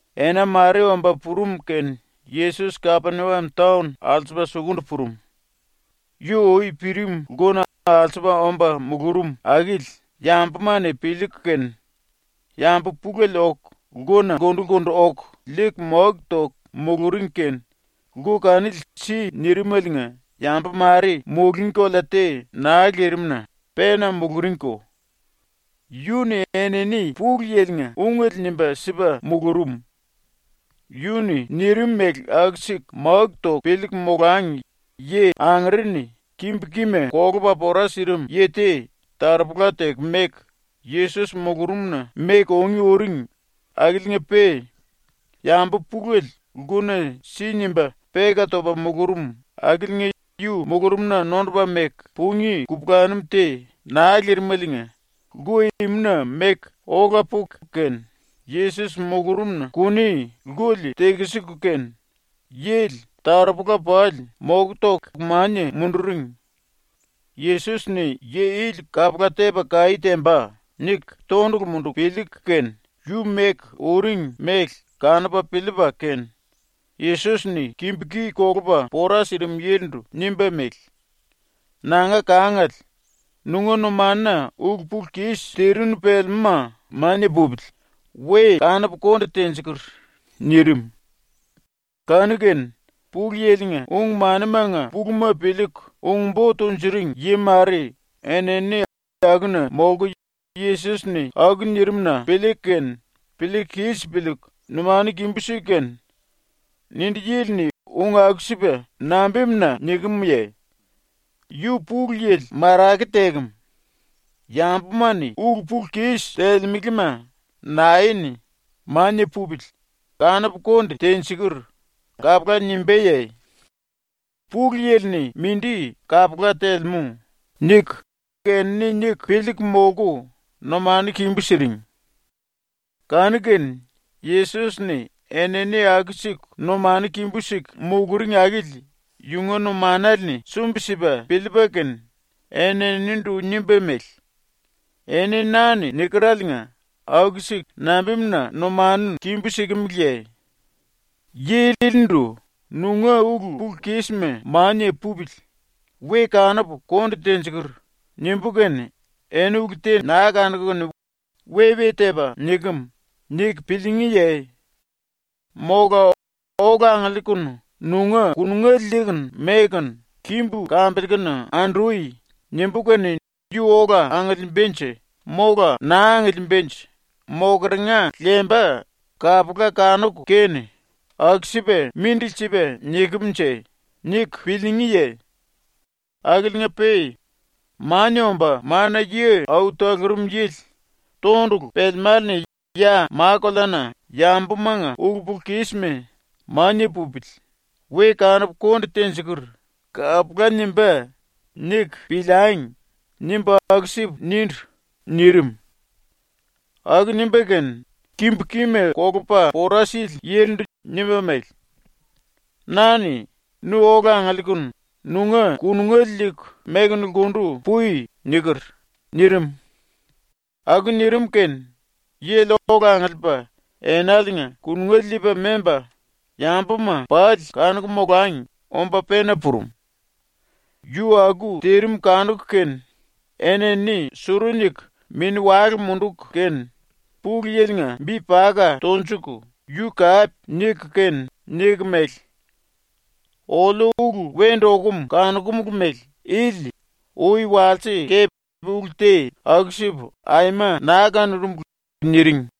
Ena mare omba purum kene Yesos Kapeniam taon alsupa sukundu purum. Yu ui pirim lkuna alsupa omba mulurum akili yambuma-ni piliiku kene yambu pulele oku lkuna lkundu-lkundu oku liiku máku toku muluring kene lku kanili si nirimeliinga yambu mare mulungí kolea te naa lirim-na pena muluringko. Yu-ni enini ⸤Pulu Yili-nga⸥ ungele nimba sipa mulurum. ⸤Yu-ni nirim mele aku-siku máku toku piliiku molangi⸥ yi angere-ni kimbu-kima kolupa pora sirim yi te taropola teku meku Yesos mulurumna meku ungí uring akiliinga-pe yambu pulele lkuna si nimba peka topa mulurum akiliinga yu mulurumna nondupa meku pungí kupulanum te naa lirimeliinga lku imuna meku ola puku kene Yesos mulurumna kuni lkuli tekisiku kene yili taropola pali moku toku mania munduring. ‘Yesos-ni yi ili kapula tepa kaí temba.’ niku tondulu munduku piliiku kene yu meku uring mele kanupa piliipa kene Yesos-ni kimbu-ki kolupa pora sirim yilindu nimba mele: “Nanga kangale, nunga numanuna ulu-pulu-kis tirinu pelemúma mania pupili, we kanupu konde tenjikur.” nirim. ⸤Kanu-kene,⸥ Pulu Yili-nga ung-manimanga puluma piliiku ung-bo tunjuring yi mare enini akuna molku ⸤Yesos-ni aku nirim-na piliiku kene piliiku kis piliiku⸥ numanu kimbú siku kene, “Nindi yili-ni ung aku-sipa nambimuna nikemye? Yu Pulu Yili marake tekem. Yambuma-ni ulu-pulu-kis telemelema nae-ni ‘Mania pupili, kanupu konde tenjikur.’ kapula nimbáye? Pulu Yili-ni mindi kapula telemú.” niku enini niku piliiku molku numanu kimbú siring. Kanu-kene Yesos-ni enini aku-siku numanu kimbú siku muluring akili yunga numanale-ni sumbi-sipa piliipa kene eninindu nimba mele: “Eni ⸤na-ni nikereliinga⸥ aku-siku nambimuna numanu kimbú sikimiliye? Yi ilindu “Nunga ulu-pulu-kisma mania pupili, we kanupu konde tenjikur.” nimbú kene eni ulu te naa kanuku kene ‘We-we tepa nikem.’ niku piliingíye? Mola “Ola angiliikunu nunga kunungele liiku mekunu kimbu kambiliikunu andui.” nimbú kene yu ola angiliimbanje mola naa angiliimbanje mokeringa lemba kapula kanuku kene ‘Aku-sipa mindili sipa nikem-nje?’ niku piliingíye? Akiliinga-pe ‘ ‘Mania Omba Mana-Yi Au Talurum Yili tondulu pelemále-ni ya ma-koleana yambumanga ulu-pulu-kisma “Mania pupili, we kanupu konde tenjikur.” kapula nimbá.’ niku piliangi.’ nimbu aku-sipu nindu.” nirim. Aku nimba kene kimbu-kima kolupa pora sili yilindu nimba mele: “Na-ni ‘Nu ola angiliikunu nunga kunungele liiku mekunu lkundu pui.’ niker.” nirim. Aku nirim kene yili ola angiliipa enaliinga kunungele liipa memba, yambuma pali kanuku molangi omba pena purum. Yu aku tirim kanuku kene enini suru niku mini-wale munduku kene Pulu Yili-nga bi paka tonjuku yu kape niku kene niku mele: “Oliu ulu wendu okum kanokumulu mele ili ui walse kepe ulu te aku-sipu aima naa kanurumulu.” niring.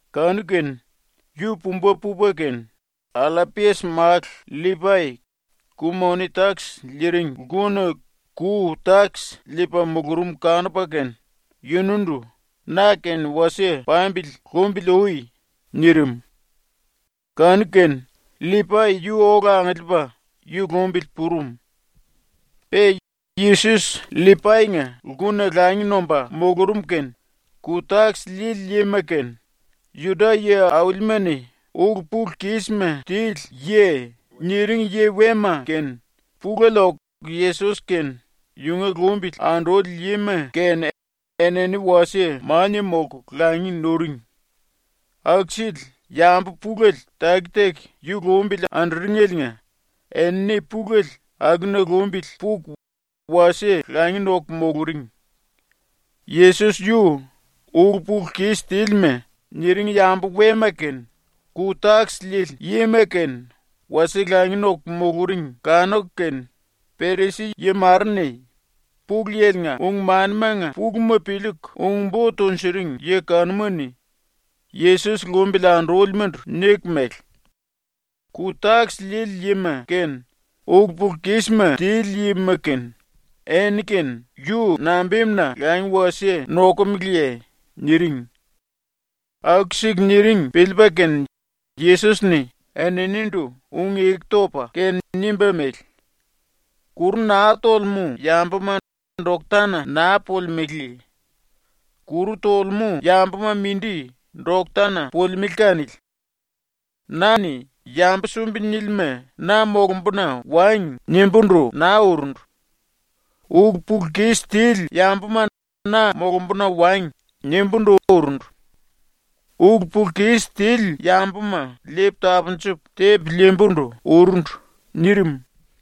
Kanu-kene yu pumba pupa kene, Allapias-málu LLipai ku-moni-takis liiring lkuna ⸤ku-takis liipa⸥ mulurum kanupa kene yunundu “Na-kene wasie pambili lumbili ui.” nirim. Kanu-kene LLipai yu ola angiliipa yu lumbili purum. Pe Yesos LLipai-nga lkuna langi nomba mulurum kene ku-takis liili yima kene, ⸤Juda yi aulima-ni⸥ “ulu-pulu-kisma tili yi” ⸤niring⸥ yi wema kene pulele oku Yesos kene yunga lumbili anduli yima kene enini wasie mania molku langi nuring. Aku-sili yambu pulele taki-taki yu lumbili anduringeliinga enini pulele ⸤akuna lumbili puku⸥ wasie langi noku muluring. Yesos yu “ulu-pulu-kis tílima” niring yambu wema kene ku-takis liili yima kene wasie langi noku muluring kanuku kene Perisi-yi mare-ni, Pulu Yili-nga ung-manimanga puluma piliiku ung-bo tunjuring yi kanuma-ni, Yesos lumbili andúlimandu niku mele: “Ku-takis liili yima kene, ulu-pulu-kisma tili yima kene, enini-kene yu nambimuna langi wasie nokomeleye?” niring. Aku-siku niring piliipa kene Yesos-ni eninindu ⸤ung-eku topa kene⸥ nimba mele: “Kuru naa tolemú yambuma doktana naa pulimelé. Kuru tolemú yambuma mindi doktana pulimelé kanili. Na-ni “Yambu sumbi nílima na molumbuna wangi.” nimbúndu naa urundu. “Ulu-pulu-kis tili yambuma na molumbuna wangi.” nimbúndu urundu. Ulu-pulu-kis tili yambuma liipu tapunjupu tepu liimbundu urundu.” nirim.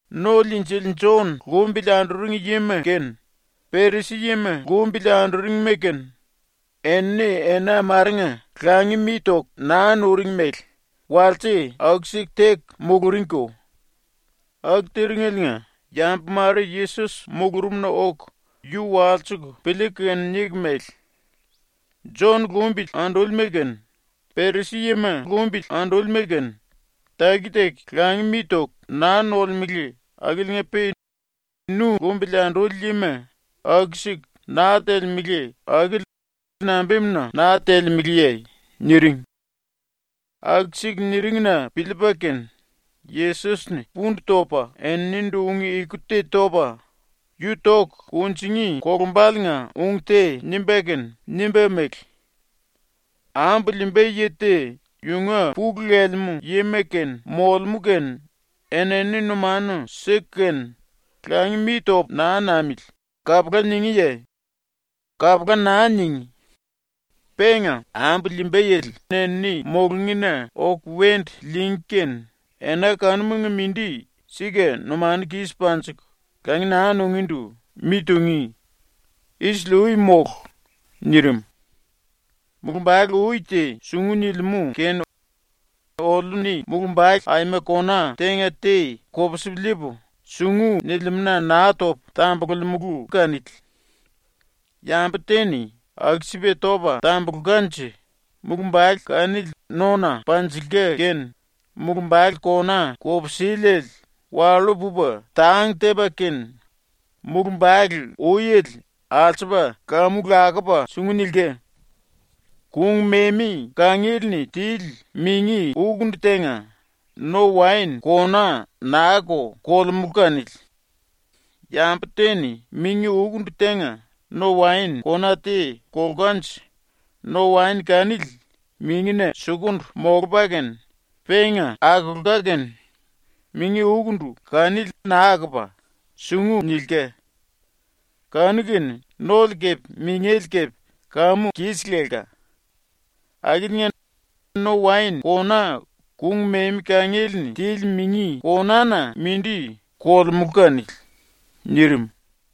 ⸤No-Liinjili⸥ Jon lumbili anduring yima kene, Perisi yima lumbili anduringima kene, enini ena marenga langi mi toku naa nuring mele walse aku-siku teku muluringko. ⸤Aku tiringeliinga⸥ yambu mare Yesos mulurumna oku yu walsiku piliiku kene niku mele: “Jon lumbili andúlima kene, Perisi-yima lumbili andúlima kene, taki-taki langi mi toku naa nolemele akiliinga-pe nu lumbili anduli yima aku-siku naa telemele akili nambimuna naa telemeleye?” niring. ⸤Aku-siku niring-na piliipa kene⸥ Yesos-ni pundu topa eninindu ⸤ung-eku te topa yu toku kunjingí kolumbaliinga ung te nimba kene⸥ nimba mele: “Ambu liimba yi te yunga pulu lelemú yima kene molemú kene enini numanu siku kene “Langi mi topu naa namili.” kapula ningíye? Kapula naa ningí. Penga ambu liimba yili enini mulungína oku wendu liingí kene ena kanumanga mindi sika ⸤numanu kis panjiku⸥ langi naa nungíndu mi tungí. ⸤Isili-ui mólu.⸥” ⸤nirim.⸥ “Mulumbale-ui te sungu nilimú kene oliu-ni mulumbale aima kona tenga te kopsipu liipu, sungu nilimúna naa topu tambululimulu kanili. Yambu te-ni aku-sipa topa tambulkanje mulumbale kanili nona panjilka kene mulumbale kona kupsiliele wallú pupa tang tepa kene mulumbale-uiele alsupa kamu lakupa sungu nilka. Kung-memi kangiele-ni tili mingi-ukundu tenga no-waen kona naa-ko kolemulu kanili. Yambu te-ni mingi-ukundu tenga no-waen kona te kolkanje no-waen kanili mingina sukundu molupa kene penga akolka kene mingi-ukundu kanili naa akopa sungu nilka. Kanu-kene nole kepe mingele kepe kamu kis lelka. Akiliinga no-waen kona kung-memi kangiele-ni tili mingi kona-na mindi kolemulu kanili.” nirim.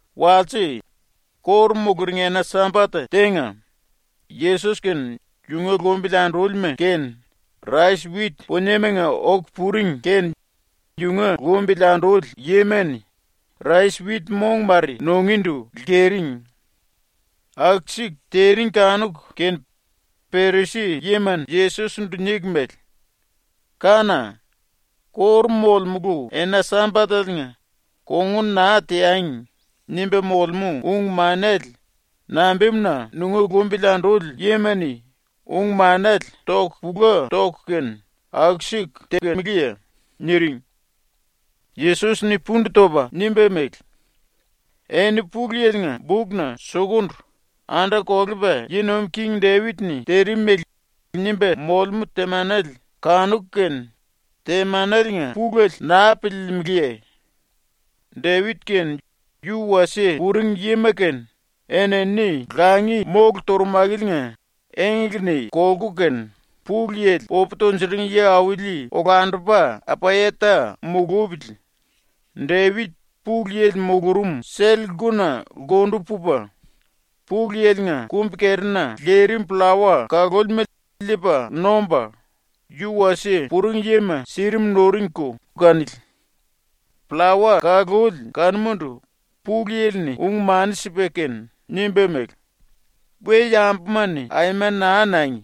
Walse, ⸤kóru muluring⸥ ena-Sambat tenga, Yesos kene yunga lumbili andúlima kene rais-wit puniemanga oku puring kene yunga lumbili anduli yima-ni rais-wit mong mare ⸤nungíndu⸥ lkering. Aku-siku tiring kanuku kene Perisi yima-ni Yesos-ndu niku mele: “Kána! ⸤Kóru molemulu⸥ ena-Sambateliinga ‘Kongun naa teangi.’ nimba molemú ung-manele nambimuna nunga lumbili anduli yima-ni ung-manele toku pula toku kene aku-siku tekemeleye?” niring. Yesos-ni pundu topa nimba mele: “Eni Pulu Yili-nga bukna sukundu ⸤anda-kolepa yi nuim king⸥ Depit-ni tirim mele nimba molemú temanele kanuku kene ⸤temaneliinga pulele⸥ naa piliilimiliye? Depit kene yu wasie puring yima kene enini ⸤langi⸥ mólu turum ⸤akiliinga⸥ engle-ni kolku kene, Pulu Yili popu tunjuring yi auli olandupa Apayata mulupili Depit Pulu Yili mulurum sell-lkuna lkundu pupa, Pulu Yili-nga kumbi-kerina lirim pllawa kalúlima liipa nomba, yu wasie puring yima sirim nuringko kanili. Pllawa kaluli kanumandu Pulu Yili-ni ung-mani sipa kene nimba mele: “We-yambuma-ni aima naa nangi!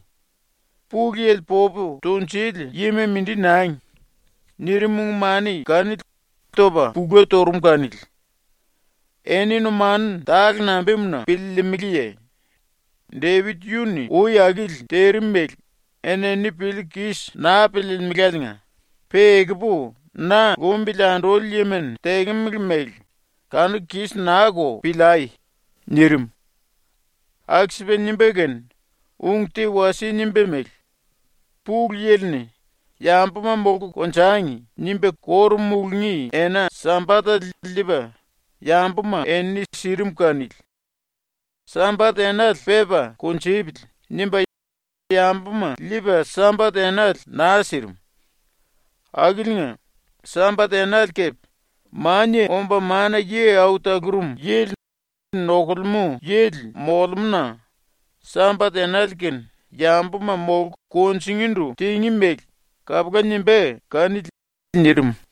Pulu Yili popu tunjuli yima mindi nangi!” nirim ⸤ung-mani kanili topa pula turum⸥ kanili. ⸤Eni numanu tale nambimuna piliilimiliye? Depit yu-ni ui akili tirim mele enini piliiku kis naa piliilimiláliinga, pe ekupu na lumbili anduli yima-ni tekemele mele kanuku kis naa-ko piliai.⸥” nirim. Aku-sipa nimba kene ung te wasie nimba mele: “Pulu Yili-ni ‘Yambuma molku konjangi.’ nimba ⸤kóru mulungí⸥ ena-Sambatele liipa yambuma-enini sirim kanili. ‘Sambat-enale pepa kunjupili.’ nimba yambuma liipa Sambat-enale naa sirim. Akiliinga Sambat-enale kepe Mania Omba Mana-Yi Au Talurum Yili nokulemú yili molemú-na ⸤Sambat-enale kene yambuma molku kunjingíndu tingí mele kapula nimbá kanili⸥.” nirim.